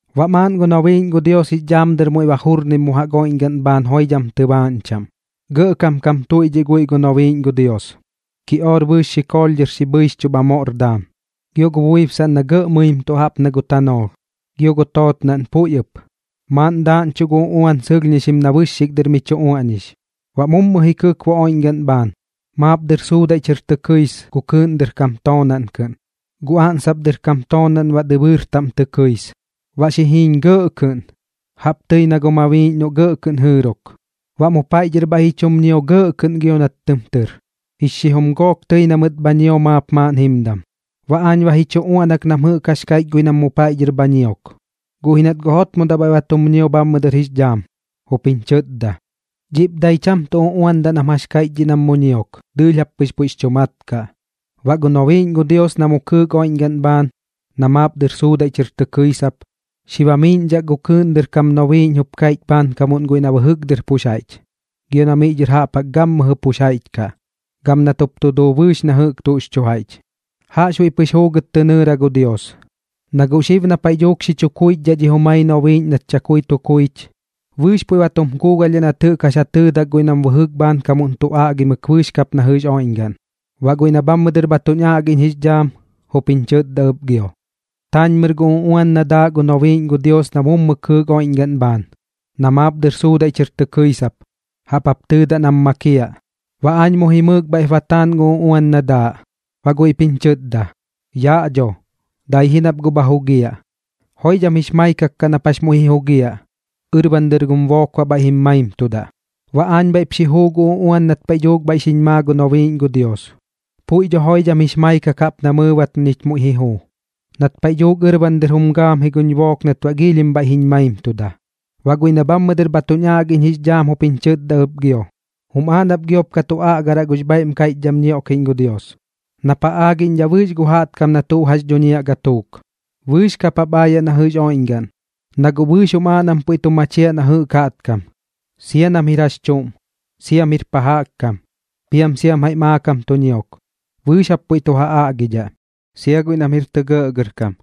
Baꞌ maaꞌn gu nobiiꞌñ gu Dios jix dhaam dɨr muiꞌ ba jurnim mu jaꞌk oiꞌñgaꞌn bhaan joidham tɨbaaꞌñ chaꞌm. Gɇꞌkam kam tuiꞌdhiꞌ guiꞌ gu nobiiꞌñ gu Dios, kiꞌoor bɨɨx xikoolh xi bhɨichdhixchuꞌ bha moꞌr daam, gio gu buibsaꞌn na gɇꞌ mɨimtuꞌ jaꞌp na gu tanoolh, gio gu tootnaꞌn puiꞌ ɨp, maaꞌn daaꞌñchuꞌ gu uꞌuan sɨlhñixim na bɨxxik dɨr mi chu uaꞌñix. Baꞌ mummu ji kɨkbo oiꞌñgaꞌn bhaan, maap dɨr suudaiꞌ chɨr tɨ kɨis gu kɨɨꞌn dɨr kam toonaꞌn kɨꞌn, gu oꞌnsop dɨr kam toonaꞌn baꞌ dɨbɨɨr taꞌm tɨ kɨis. Baꞌ xi jiiñ gɇꞌ kɨꞌn, jaꞌp tɨi na gu mabiiꞌñ noꞌ gɇꞌ kɨꞌn jɨɨrok. Baꞌ mu paiꞌ dhɨr bhaiꞌ ji chum ñio gɇꞌ kɨꞌn gio nat tɨm tɨr, jix xijum gook tɨi na mɨt bha ñio maap maaꞌn jimdam. Baꞌ aañ ba ji chu uaꞌnak nam jɨꞌk jax kaiꞌch guiꞌ nam mu paiꞌ dhɨr bha ñiok, guꞌ ji nat guꞌ jotmodaꞌ bhaiꞌ ba tum ñio bhammɨ dɨr jix dhaam, jup jiñ chɨtda: ―Dhiꞌp dai cham tuꞌ uꞌuandaꞌ nam jax kaiꞌch dhiꞌ nam mu ñiok, dɨɨlh jap pɨx puiꞌx chu mat kaꞌ. Baꞌ gu nobiiꞌñ gu Dios na mu kɨɨk oiꞌñgaꞌn bhaan, na maap dɨr suudaiꞌ chɨr tɨ kɨisap, xi bamiiꞌñdhak gu kɨɨꞌn dɨr kam nobiiꞌñ jup kaiꞌch bhaankamuꞌn guiꞌ na bɨjɨk dɨr pux jaiꞌch, gio na miꞌ dhɨr jaꞌp jaꞌk gammɨjɨ pux jaiꞌch kaꞌ, gam nat jup tu duu bɨɨx na jɨꞌk tuꞌx chu jaiꞌch: ―Jaꞌxbuiꞌ pɨx juugɨt tɨ nɨɨra gu Dios, na guꞌ xib na paiꞌ dhuuk xi chu kuichdhaꞌ dhi jumai nobiiꞌñ nat chakui tu kuich, bɨɨx puiꞌ ba tu kuugalhdhaꞌ nat jɨꞌk jax ja tɨɨdak guiꞌ nam bɨjɨk bhaankamuꞌn tu aꞌgimɨk bɨɨx kap na jɨꞌx oiꞌñgaꞌn. Baꞌ guiꞌ na bhammɨ dɨr bha tuñ aꞌgiꞌñ jix dhaam, jup jiñ chɨtda ɨp gio: ―Taañmɨr gu uꞌuan na daaꞌ gu nobiiꞌñ gu Dios na mu kɨɨk oiꞌñgaꞌn bhaan, na maap dɨr suudaiꞌ chɨr tɨ kɨisap, jaꞌp jap tɨɨdaꞌ nam makiaꞌ. Baꞌ aañ mu jimɨɨk bhaiꞌp ba taan gu uꞌuan na daaꞌ, baꞌ guiꞌp jiñ chɨtda: ―Yaꞌ dho, dai ji nap guꞌ bha jugiaꞌ. Joidham jix maikak kaꞌ nap muiꞌ ji jugiaꞌ, ɨrban dɨr gum book baꞌ bhaiꞌ jim maimtudaꞌ. Baꞌ aañ bhaiꞌp xi juu gu uꞌuan nat paiꞌ dhuuk bhaiꞌ xiñ maa gu nobiiꞌñ gu Dios. Puiꞌ dho joidham jix maikak jaꞌp na mɨɨbat na ñich muiꞌ ji juu, nat paiꞌ dhuuk ɨrban dɨr jum gaam ji guñ book nat baꞌ giilhim bhaiꞌ jiñ maimtuda. Baꞌ guiꞌ na bhammɨ dɨr bha tuñ aꞌgiꞌñ jix dhaam jup jiñ chɨtda ɨp gio: ―Jum aaꞌ nap giop ka tu aꞌgaraꞌ gux bhaiꞌm kaiꞌchdham ñioꞌkiꞌñ gu Dios, nap ja aagiꞌñdhaꞌ bɨɨx gu jaꞌtkam na tuꞌ jax dhuñiaꞌ gatuuk. Bɨɨx kap jap aayaꞌ na jɨꞌx oiꞌñgaꞌn, na guꞌ bɨɨx jum aaꞌ nam puiꞌ tu machiaꞌ na jɨꞌk jaꞌtkam, sia nam jir jax chuꞌm, siam jir pa jaꞌk kam, piam siam jaiꞌ maakam tu ñiok, bɨɨx jap puiꞌ tu ja aꞌgiꞌdhaꞌ, sia guiꞌ nam jir tɇ gɇꞌgɇrkam.